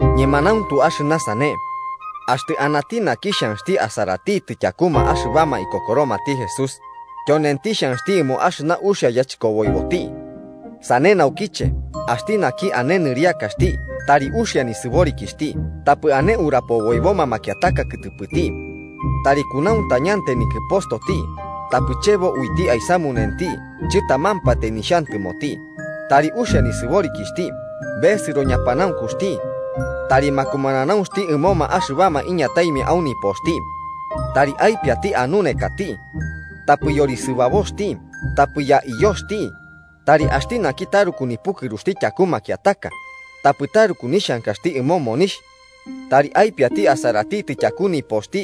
Ñemanauntu axɨna sane. Axtɨ anati naki xhanxti asaratitɨ tyakuma axɨbama ikokoromati Jesús, tyonenti xhanxti ɨmo axɨna uxia yachɨkoboiboti. Sane naukiche, axti naki ane nɨriakaxti tari uxia nisɨborikixhti tapɨ ane urapoboiboma makiataka kɨtɨpɨti. Tari kunauntañantai nikɨpostoti tapɨ chebo uiti aisamunenti chɨtamampatai nixhantɨmoti, tari uxia nisɨborikixhti besɨro ñapanaunkuxti. Tari makumananaunxti ɨmoma axɨbama iñataimia au nipoxti. Tari aipiati anunekati. Tapɨ yorisɨbaboxti tapɨ yaiyoxti, tari axti naki taruku nipukɨruxti tyaku makiataka, tapɨ taruku nixhankaxti ɨmo monixh. Tari aipiati asaratitɨ tyaku nipoxti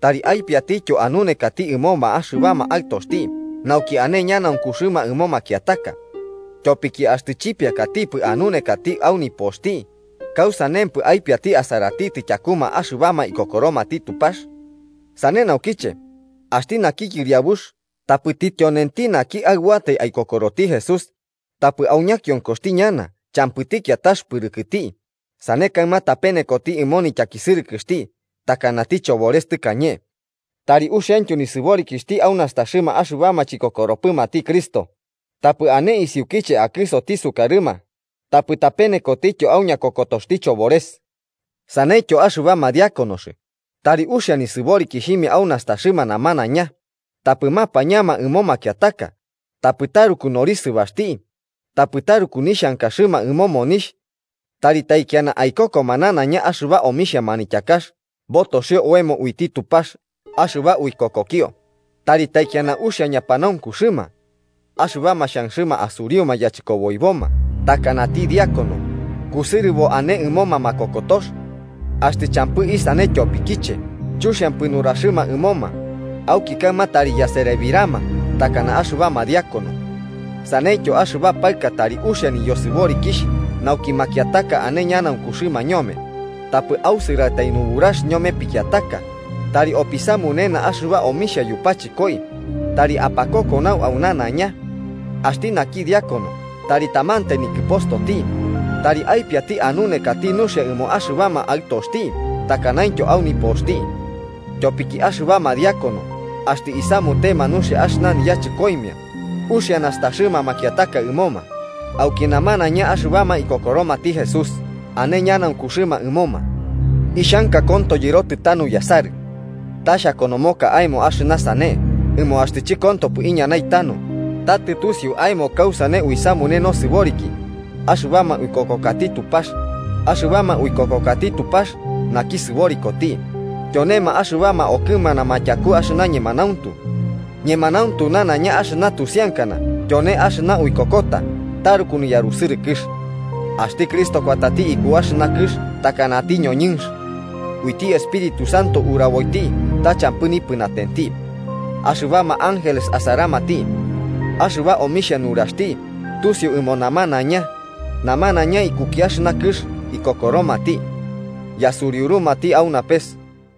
tari aipiatityo anunekati ɨmoma axɨbama aɨtoxti nauki ane ñanaunkuxɨma ɨmo makiataka. Tyopiki axtɨ chipiakatipɨ anunekati au nopoxti, ¿kausanempɨ aipiati asaratitɨ tyakuma axɨbama ikokoromati Tupax? Sane naukiche, axti naki yɨriabux tapɨti tyonenti naki aɨbuatai aikokoroti Jesús, tapɨ au ñakionkoxti ñana champɨti kiatax pɨrɨkti sane kaɨma tapenekoti ɨmo nityakisɨrɨkɨxti takanati chobores tɨkañe. Tari uxiaintyo nisɨborikixhti au nastaxɨma axɨbama chikokoromatipɨ Cristo, tapɨ ane isiukiche akɨsoti sukarɨma tapɨ tapenekotityo au ñakokotoxti chobores. Saneityo axɨbama Diáconos, tari uxia nisɨborikixhimia au nastaxɨma namanaiña, tapɨ mapañama ɨmo makiataka tapɨ taru norisɨbaxti, tapɨ taruku nixhankaxɨma ɨmo monixh. Tari taikiana aikokoma nanaiña axɨba omixhia manityakax botoxio oemo uiti Tupax axɨba uikokokio, tari taikiana uxia ñapanaunkuxɨma. Axɨbama xhanxɨma asuriuma yachɨkoboiboma takanati Diácono, kusɨrɨbo ane ɨmoma makokotox. Axtɨ champɨ isane tyopikiche chuxiampɨ nuraxɨma ɨmoma, auki kaɨma tari yaserebirama takana axɨbama Diácono. Saneityo axɨba paɨka tari uxia niyosɨborikixh nauki makiataka ane ñanaunkuxɨma ñome, tapɨ ausɨrtai nuburax ñome pikiataka, tari opisamunena axɨba omixhia yupachɨkoi, tari apakokonau au nanaiña. Axti naki Diácono tari tamantai nikɨpostoti, tari aipiati anunekati nuxia ɨmo axɨbama aɨtoxti takanaintyo au nipoxti. Tyopiki axɨbama Diácono axtɨ isamutema nuxia axɨna niyachɨkoimia, uxia nastaxɨma makiataka ɨmoma, auki namanaiña axɨbama ikokoromati Jesús ane ñanaunkuxɨma ɨmoma. Ixhanka konto yɨrotɨ tanu yasarɨ. Ta xhakonomoka aemo axɨna sane ɨmo axtɨ chɨkontopɨ iñanai tanu, ta tɨtusiu aemo kausane uisamune nosɨboriki axɨbama uikokokati Tupax, axɨbama uikokokati Tupax naki sɨborikoti, tyonema axɨbama okɨmanama tyaku axɨna ñemanauntu. Ñemanauntu nanaiña axɨna tusiankana tyone axɨna uikokota taruku niyarusɨrɨkɨx: Axti Cristo kuatati iku axɨna kɨx takanati ñoñɨnx. Uiti Espíritu Santo uraboiti ta champɨ nipɨnatenti. Axɨbama ángeles asaramati. Axɨba omixhia nuraxti tusiu ɨmo namanaiña, namanaiña ikuki axɨna kɨx ikokoromati. Yasuriurumati au napes.